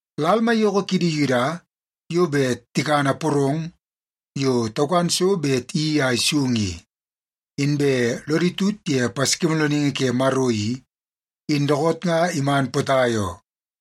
Lal maiyoko kidi Yuda yo bet tikana porong yo taukan so bet iyeii a isung i, inbe lodi tut ye Paskimoolooningi ke Maro i, in dookoot nga iman potai oo.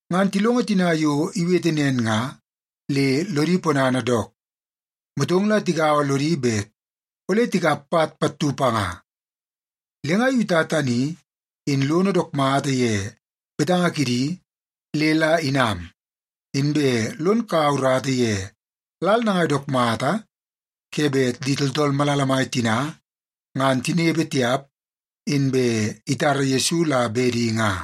Ngan tilongo tina yo iwete nen nga le lodi ponana dook, motong la tigaua lodi bet ole tikap pat pattu panga. Le nga Yuta tani in lono dook mata ye betanga kidi le la inam, inbe lon kaua urata ye lal nangai dook mata ke bet di tooltool malala mai tina ngan tinepe tiap, inbe itara Yesu la bedi nga.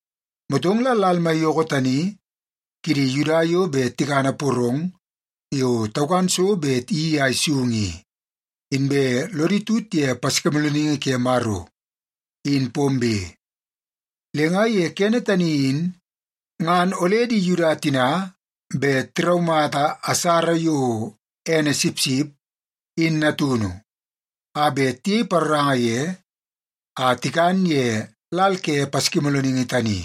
Motong la lal maiyoko tani kidi Yuda yo bet tikana porong yo taukan so bet iyeii a isung i, inbe lodi tut ye Paskimoolooningi ke Maro, in pombe. Le nga ye kene tani in, ngan ole di Yuda tina bet tiraumata asara yo ene sipsip in natunu a bet tiyei paroranga ye a tikan ye lal ke Paskimoolooningi tani.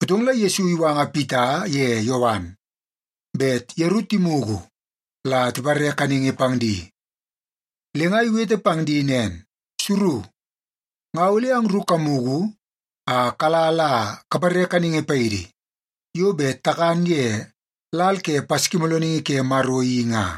Motong la Yesu iwanga Pita ye Yowan bet yeru timugu la tipare kaningi pang di. Le nga iwete pang di nen, “Suru, nga ole angru kamugu a kala la kapare kaningi paidi yo bet takan ye lal ke Paskimoolooningi ke Maro i nga.”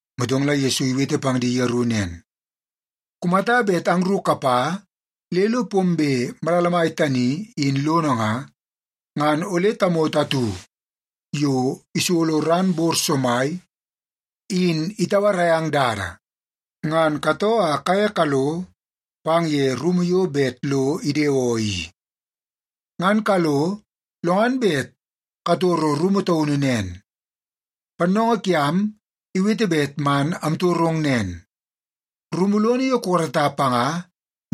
Motong la Yesu iwete pang di yeru nen, “Kumata bet angru kapa le lo pombe malala mai tani in lono nga, ngan ole tamoto atu yo isolo ran bor somai in itauarai ang dada. Ngan katoo a kaye kalo pang ye rumu yo bet lo idewoo i. Ngan kalo, lo ngan bet katoro rumu taunu nen, ‘Pannoongoo kiam iwete bet man amtorong nen: Rumu lono yo kukarata panga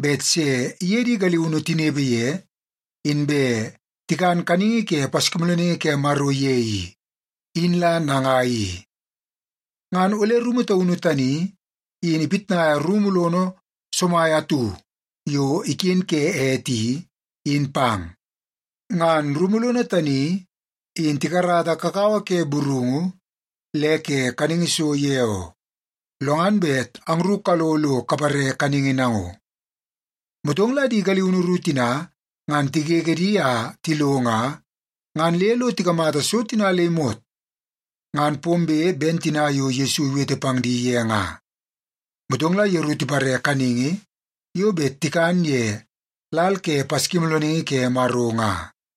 bet se iye di galiunu tinepe ye, inbe tikana kaningi ke Paskimoolooningi ke Maro ye i, in la nangai i?’ Ngan ole rumu taunu tani in ipitnaia rumu lono somai atu yo iken ke ete i, in pang. Ngan rumu lono tani in tikarata kakawa ke burungu le ke kaningi so ye oo. Lo ngan bet angru kalo lo kapare kaningi nango.” Motong la di galiunu ru tina ngan tigege di a tilo nga, ngan le lo tikamata so tina le imot ngan pombe ben tina yo Yesu iwete pang di ye nga. Motong la yeru tipare kaningi yo bet tikan ye lal ke Paskimoolooningi ke Maro nga.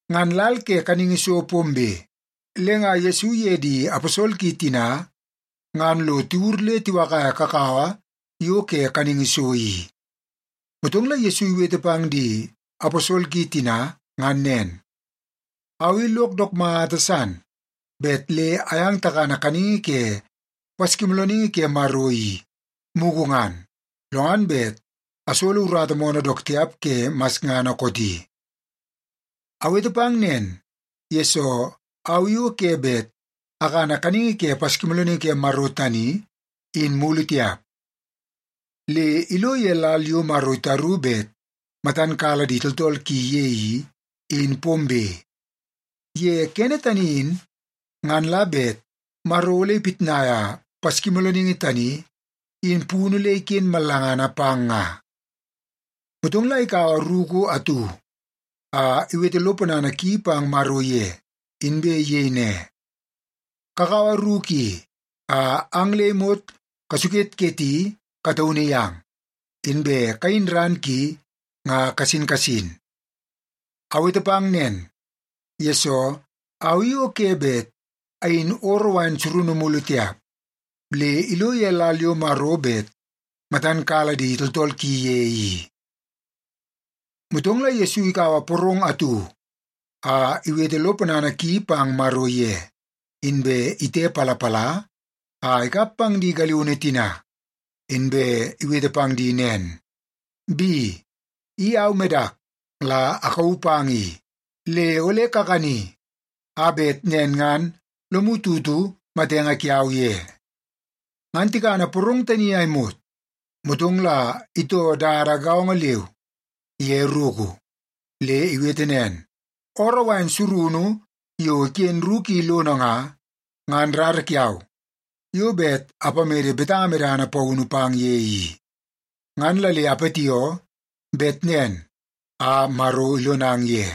Ngan lal ke kaningi so pombe, le nga Yesu iye di aposol ki tina ngan lo tiwur le tiwakaia kakawa yo ke kaningi so i. Motong la Yesu iwete pang di aposol ki tina ngan nen, “Au i lok dook mata san bet le ayang takana kaningi ke Paskimoolooningi ke Maro i, mugu ngan, lo ngan bet asolo urata moonoo dook tiap ke masngana kooti. Awete pang nen, yesoo au i o ke bet akana kaningi ke Paskimoolooningi ke Maro tani in mulu tiap, le ilo ye lal yo Maro itaru bet matan kala di tooltool ki ye i, in pombe. Ye kene tani in, ngan la bet Maro ole ipitnaia Paskimoolooningi tani, in punu le iken mallangana pang nga.” Motong la ikaua ruku atu a iwete lo ponana ki pang Maro ye, inbe iyei ne, “Kakaua ruku i a ang le imot kasuketketi kataunu yang, inbe kayin ran ki nga kasin kasin. Awete pang nen, yesoo au i o ke bet ayin ooroo surunu mulu tiap, le ilo ye lal yo Maro bet matan kala di tooltool ki ye i.” Motong la Yesu ikaua porong atu a iwete lo ponana ki pang Maro ye, inbe itepalapala a ikap pang di galiunu tina, inbe iwete pang di nen, “Bi, i au medak la akauu pang i. Le ole kakani a bet nen ngan lomu tutu matenge kiau ye.” Ngan tikana porong tani a imot, motong la itoo dada gaongo leu ye ruku. Le iwete nen, “Ooroo wain surunu yo iken ruku i lono nga, ngan rara kiau yo bet apamede betanga medana paunu pang ye i. Ngan la le apatioo bet nen a Maro ilonang ye.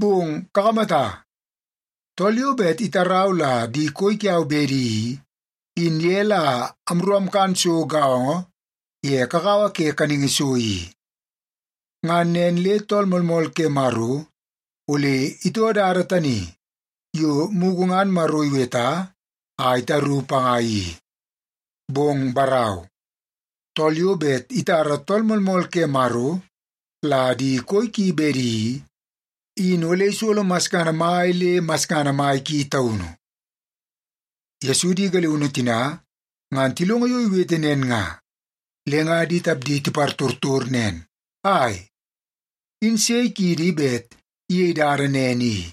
Bong kakamata! Tool yo bet itarau la di koi kiau bedi i, in ye la amru amkan so gaongo ye kakawa ke kaningi so i. Ngan nen le Tool Moolmool ke Maro ole itoo dada tani yo mugu ngan Maro iweta a itaru panga i. Bong barau, tool yo bet itara Tool Moolmool ke Maro la di koi ki bedi i, in ole isolo masngana mai le masngana mai ki taunu.” Yesu di galiunu tina, ngan tilongo yo iwete nen nga, le nga di tapdi tipartortor nen, “Ai, in sei kiidi bet iyeie dada nen i?”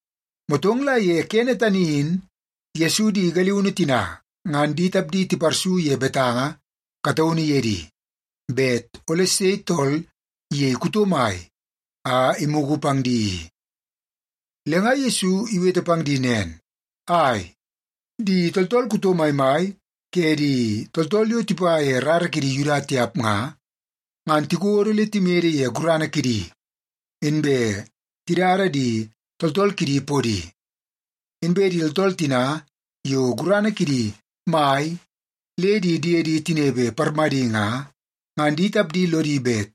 Motong la ye kene tani in Yesu di galiunu tina ngan di tapdi tiparsu ye betanga kataunu ye di, bet ole sei tool iyei kuto mai a imugu pang di i. Le nga Yesu iwete pang di nen, “Ai, di tooltool kuto maimai ke di tooltool yo tipa ye rara kidi Yuda tiap nga, ngan tikodo le timede ye gurana kidi, inbe tidada di tooltool kidi podi. Inbe di tooltool tina yo gurana kidi mai le di diedi tinepe parmadi nga, ngan di tapdi lodi bet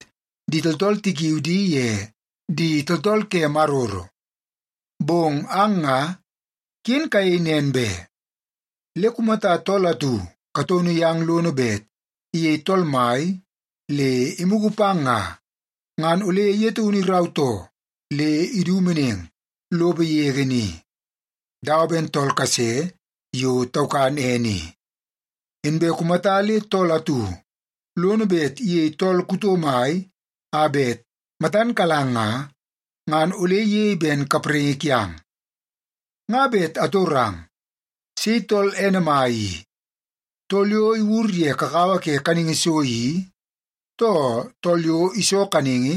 di tooltool tikiui di ye ‘Di Tooltool ke Maroro.’ Bong ang nga, ken kayei nen be. Le kumata tool atu kataunu yang lono bet iyei tool mai le imugu pang nga, ngan ole ye taunu irautoo le idu meneng lopo yege ni, dawa ben tool kase yo taukan ene i. Inbe kumata le tool atu lono bet iyei tool kuto mai a bet matan kalang nga, ngan ole iyei ben kapraingi kiang. Nga bet atorang, sei tool ene mai i, tool yo iwur ye kakawa ke kaningi so i, too tool yo iso kaningi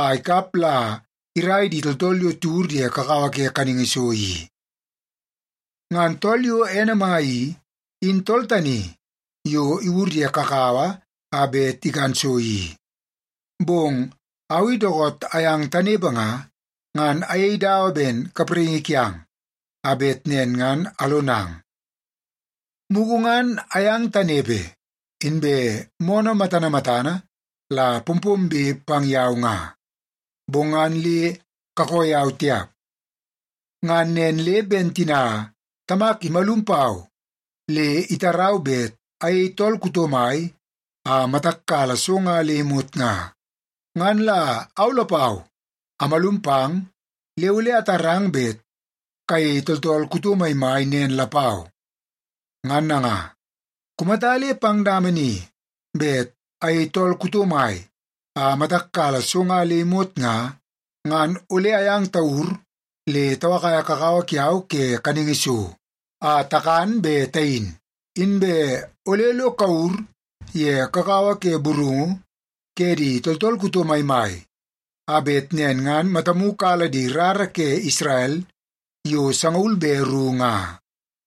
a ikap la irai di tooltool yo tiwur ye kakawa ke kaningi so i? Ngan tool yo ene mai i, in tool tani yo iwur ye kakawa a bet ikan so i. Bong au i dookoot ayang tanepe nga, ngan ayei dawa ben kapraingi kiang, a bet nen ngan alonang. Mugu ngan ayang tanepe, inbe moonoo matana matana la pompombe pang yau nga, bong ngan le kakoo yau tiap. Ngan nen le ben tina Tamak imalum pau le itarau bet ayei tool kuto mai a matak kala so nga le imot nga, ngan la au lapau amalum pang le ole atarang bet kayei tooltool kuto maimai nen lapau. Ngan nanga, kumata le pang dama ni bet ayei tool kuto mai a matak kala so nga le imot nga, ngan ole ayang tawur le tawakaia kakawa kiau ke kaningi so a takan be tayin, inbe ole lo kawur ye kakawa ke burungu ke di tooltool kuto maimai, a bet nen ngan matamu kala di rara ke Isrel yo sangaul be ru nga.”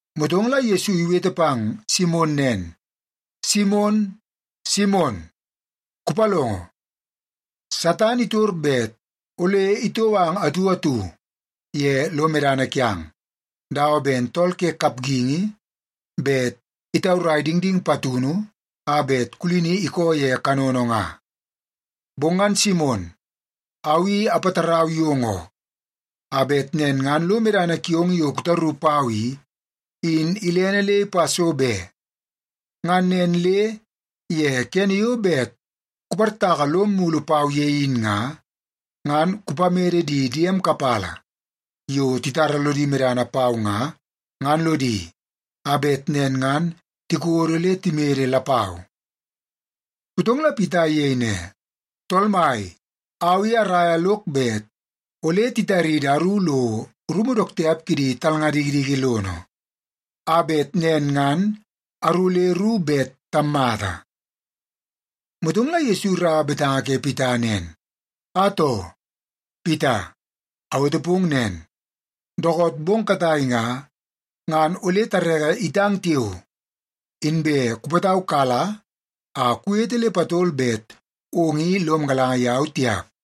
Motong la Yesu iwete pang Simon nen, “Simon, Simon, kupalongo! Satan itor bet ole itou ang atu atu ye lo medana kiang, dawa ben tool ke kapgingi bet itaurai dingding patunu a bet kulini ikoo ye kanono nga. Bong ngan Simon, au i apatarau yong oo, a bet nen ngan lo medana kiong yo kutaru pau i, in ilene le ipa so be. Ngan nen le ye kene yo bet kuportaka lom mulu pau ye in nga, ngan kupamede di diem kapala yo titara lodi medana pau nga, ngan lodi, a bet nen ngan tikodo le timede lapau.” Motong la Pita iyei ne, “Tool Mai, au i araia lok bet ole titaridi aru lo rumu dook tiap kidi talnga dikidiki lono, a bet nen ngan aru le ru bet tammata.” Motong la Yesu iraua betanga ke Pita nen, “Atoo, Pita! Awete pong nen, dookoot bong katai nga, ngan ole tareke itang tiao, inbe kupataukala a kuwete le patol bet ong i lom galanga yau tiap.”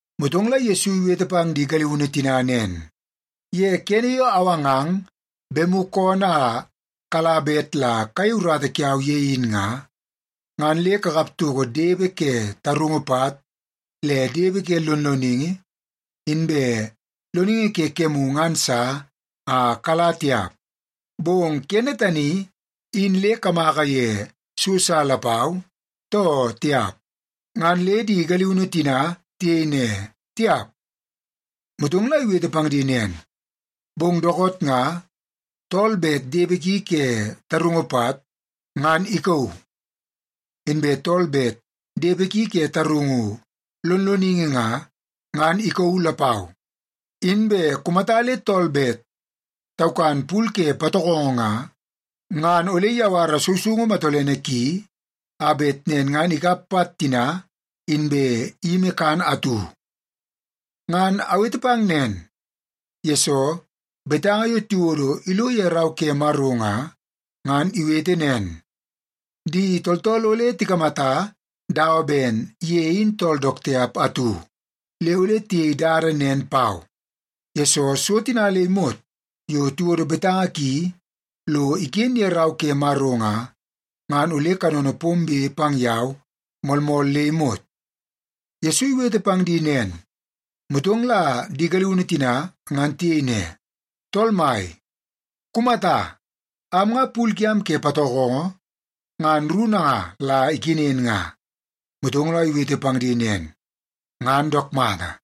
Motong la Yesu iwete pang di galiunu tina nen, “Ye kene yo awangang bemu koonoo a kala bet la kayei urata kiau ye in nga, ngan le kakap toko depe ke tarungu pat, le depe ke lonloningi, inbe loningi ke kemu ngan sa a kala tiap. Bong kene tani in le kamaka ye so sa lapau, too tiap?” Ngan le di galiunu tina tiyei ne, “Tiap.” Motong la iwete pang di nen, “Bong dookoot nga, tool bet depe ki ke tarungu pat, ngan ikauu. Inbe tool bet depe ki ke tarungu lonloningi nga, ngan ikauu lapau. Inbe kumata le tool bet taukan pul ke patokongo nga, ngan ole iyawara sousoungu matolene ki, a bet nen ngan ikap pat tina, inbe iyimi kan atu. Ngan awete pang nen, yesoo betanga yo tiwodo ilo ye Rau ke Maro nga, ngan iwete nen, ‘Di tooltool ole tikamata dawa ben ye in tool dook tiap atu.’ Le ole tiyei dada nen pau, yesoo so tina le imot yo tiwodo betanga ki lo iken ye Rau ke Maro nga, ngan ole kanono pombe pang yau moolmool le imot.” Yesu iwete pang di nen, motong la di galiunu tina ngan tiyei ne, “Tool Mai, kumata! Am nga pul kiam ke patokongo ngan ru nanga la ikenen nga.” Motong la iwete pang di nen, “Ngan dook mata.”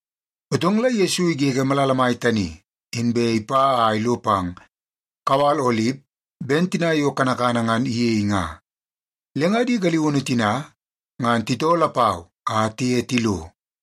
Motong la Yesu igege malala mai tani, inbe ipa a ilo pang kawal Olip ben tina yo kanakana ngan iyei nga. Le nga di galiunu tina ngan titoo lapau a tiye tilo.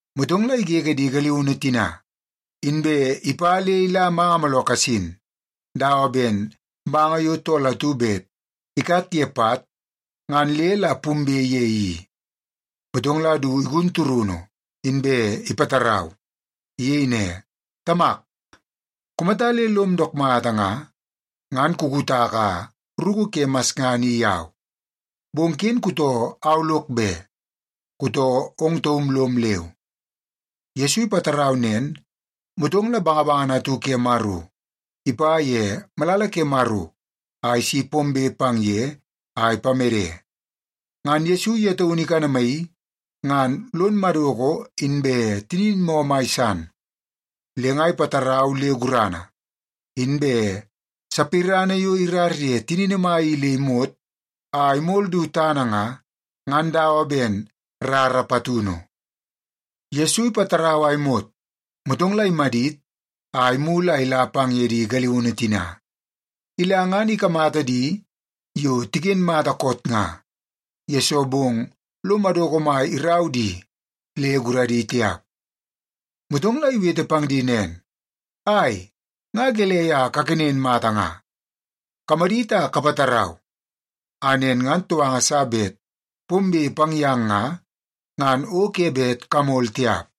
Motong la igege di galiunu tina, inbe ipa le ila manga mooloo kasin, dawa ben manga yo tool atu bet ikat ye pat ngan le la pumbe ye i. Motong la du igun turunu, inbe ipatarau. Iyei ne, “Tamak, kumata le lom dook mata nga, ngan kukutaka ruku ke masngana i yau. Bong ken kutoo au lok be, kutoo ong taum lom leu.” Yesu ipatarau nen, motong la bangabangana atu ke Maro ipa ye malala ke Maro a isi pombe pang ye a ipamede. Ngan Yesu ye taunu ikanamaii ngan lon madoko inbe tinin moo mai san, le nga ipatarau le gurana. Inbe sapirana yo irar ye tinini mai i le imot a imol du tana nga, ngan dawa ben rara patunu. Yesu ipatarau a imot, motong la imadit a imulu a ila pang ye di galiunu tina. Ila, ngan ikamata di yo tiken mata koot nga, yesoo bong lo madoko mai irau di le guradi tiap. Motong la iwete pang di nen, “Ai, nga gelei a kaken mata nga? Kamadit a kapatarau, a nen ngan touanga sa bet pombe pang yang nga, ngan o ke bet kamol tiap.”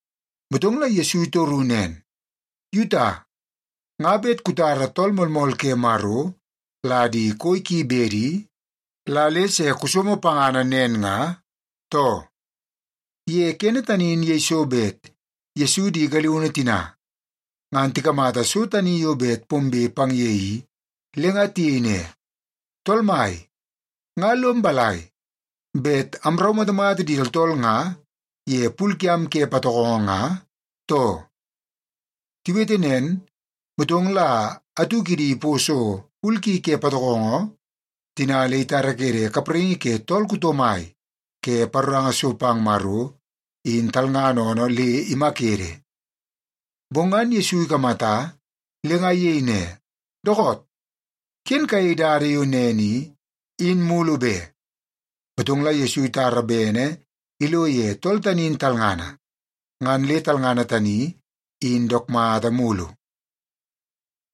Motong la Yesu itoru nen, “Yuta, nga bet kutara Tool Moolmool ke Maro la di koi ki bedi, la le se kusomo pangana nen nga, too?” Ye kene tani in yeiso bet Yesu di galiunu tina ngan tikamata so tani yo bet pombe pang ye i, le nga tiyei ne, “Tool Mai, nga lom balai, bet amraumatamata di tooltool nga ye pul kiam ke patokongo nga, too?” Tiwete nen, motong la atu kidi iposo pul ki ke patokongo tina le itarakede kapraingi ke tool kuto mai ke paroranga so pang Maro, in talngana oonoo, le imakede. Bong ngan Yesu ikamata, le nga iyei ne, “Dookoot! Ken kuyei dada yo nen i, in mulu be.” Motong la Yesu itara bene ilo ye tool tani in talngana, ngan le talngana tani in dook mata mulu.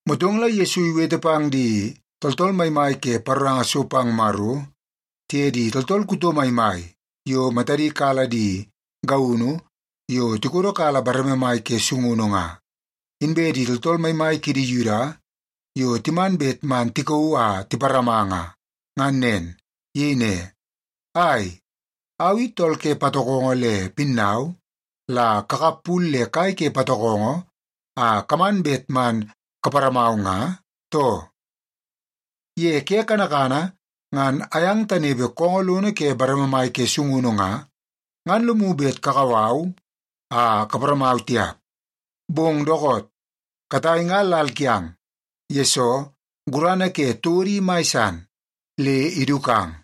Motong la Yesu iwete pang di tooltool maimai ke paroranga so pang Maro, tiye di tooltool kuto maimai yo matadi kala di gaunu yo tikodo kala bareme mai ke sungunu nga, inbe di tooltool maimai kidi Yuda yo timan bet man tikauu a tiparama nga, ngan nen. Iyei ne, “Ai, au i tool ke patokongo le pinnau la kakap pul le kai ke patokongo a kaman bet man kaparamau nga, too? Ye ke kanakana ngan ayang tanepe koongoo lono ke bareme mai ke sungunu nga, ngan lomu bet kakau au a kaparamau tiap. Bong dookoot, katai nga lal kiang, yesoo gurana ke todo in mai san, le idukang.”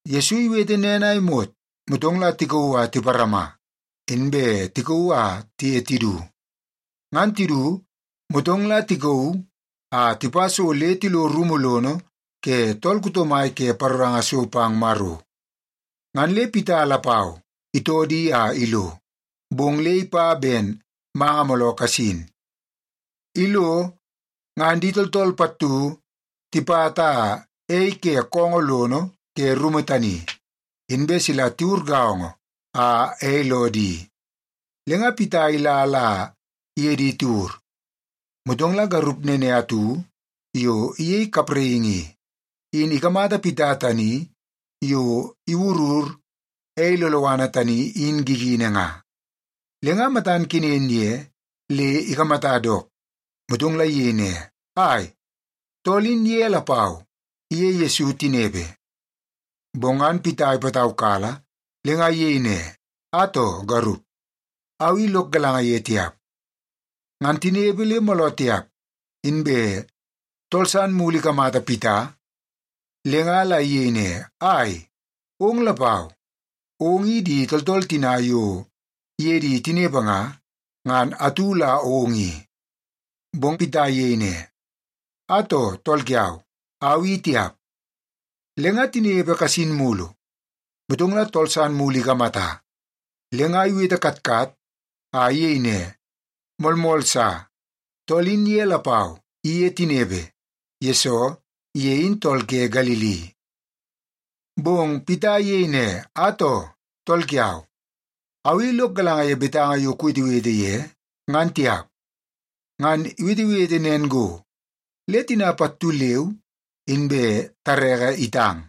Yesu iwete nen a imot, motong la tikauu a tiparama, inbe tikauu a tiye tidu. Ngan tidu, motong la tikauu a tipa so le tilo rumu lono ke tool kuto mai ke paroranga so pang Maro. Ngan le Pita lapau itoo di a ilo, bong le ipa ben manga mooloo kasin. Ilo, ngan di tooltool pattu tipata ei ke koongoo lono ke rumu tani, inbe sila tiwur gaongo a ei loo di. Le nga Pita ila la iye di tiwur. Motong la garup nene atu yo iyei kapraingi i, in ikamata Pita tani yo iwurur ei loloana tani in gigini nga, le nga matan kenen ye le ikamata dook, motong la iyei ne, “Ai, tool in ye lapau iye Yesu tinepe.” Bong ngan Pita ipataukala, le nga iyei ne, “Atoo, garup, au i lok galanga ye tiap.” Ngan tinepe le mooloo tiap, inbe tool san mulu ikamata Pita le nga la iyei ne, “Ai, ong lapau, ong i di tooltool tina yo iye di tinepe nga, ngan atu la ong i.” Bong Pita iyei ne, “Atoo, tool kiau, au i tiap.” Le nga tinepe kasin mulu, motong la tool san mulu ikamata, le nga iwete katkat a iyei ne, “Moolmool sa, tool in ye lapau iye tinepe, yesoo ye in tool ke Galili.” Bong Pita iyei ne, “Atoo, tool kiau, au i lok galanga ye betanga yo kuwetewete ye, ngan tiap!” Ngan iwetewete nen go, le tina pattu leu inbe tareke itang.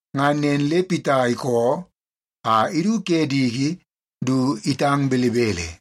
Ngan nen le Pita ikoo a idu ke diki du itang belebele.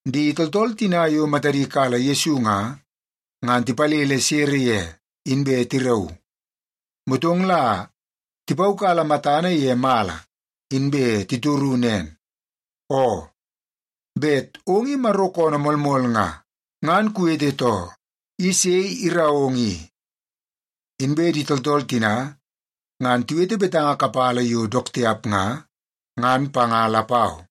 Di tooltool tina yo matadi kala Yesu nga, ngan tipalele sere ye, inbe tirauu. Motong la tipaukala matana ye mala, inbe titoru nen, “Oo, bet ong i Maro koonoo moolmool nga, ngan kuwete too. I sei irau ong i?” Inbe di tooltool tina ngan tiwete betanga kapala yo dook tiap nga, ngan panga lapau.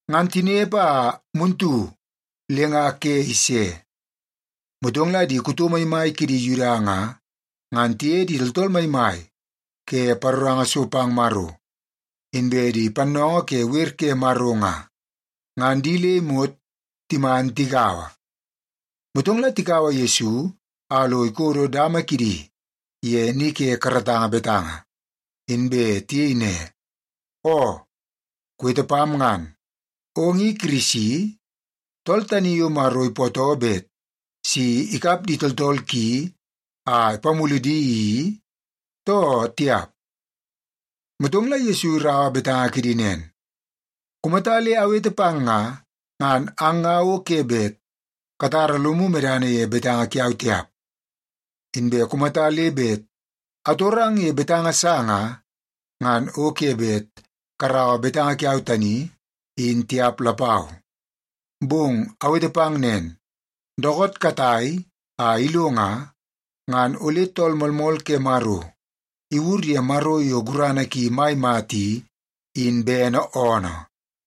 Ngan tinepe a muntu le nga ke ise, motong la di kuto maimai kidi Yuda nga, ngan tiye di tooltool maimai ke paroranga so pang Maro, inbe di pannoongoo ke wer ke Maro nga, ngan di le imot timan tigaua. Motong la tikaua Yesu a lo ikodo dama kidi ye ni ke karatanga betanga, inbe tiyei ne, “Oo, kuwete pam ngan. Ong i Kirisi, tool tani yo Maro ipootoo bet si ikap di tooltool ki a ipamulu di i, too tiap?” Motong la Yesu iraua betanga kidi nen, “Kumata le awete pang nga, ngan ang nga o ke bet katara lomu medana ye betanga kiau tiap. Inbe kumata le bet atorang ye betanga sa nga, ngan o ke bet karaua betanga kiau tani, in tiap lapau. Bong awete pang nen, dookoot katai a ilo nga, ngan ole Tool Moolmool ke Maro iwur ye Maro yo gurana ki mai mata i, in bene oonoo.”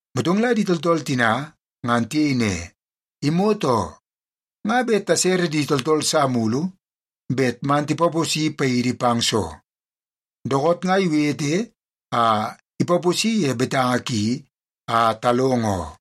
Motong la di tooltool tina ngan tiyei ne, “Imot oo! Nga bet tasere di tooltool sa mulu bet man tipaposi paidi pang soo? Dookoot nga iwete a ipaposi ye betanga ki a talongo oo.”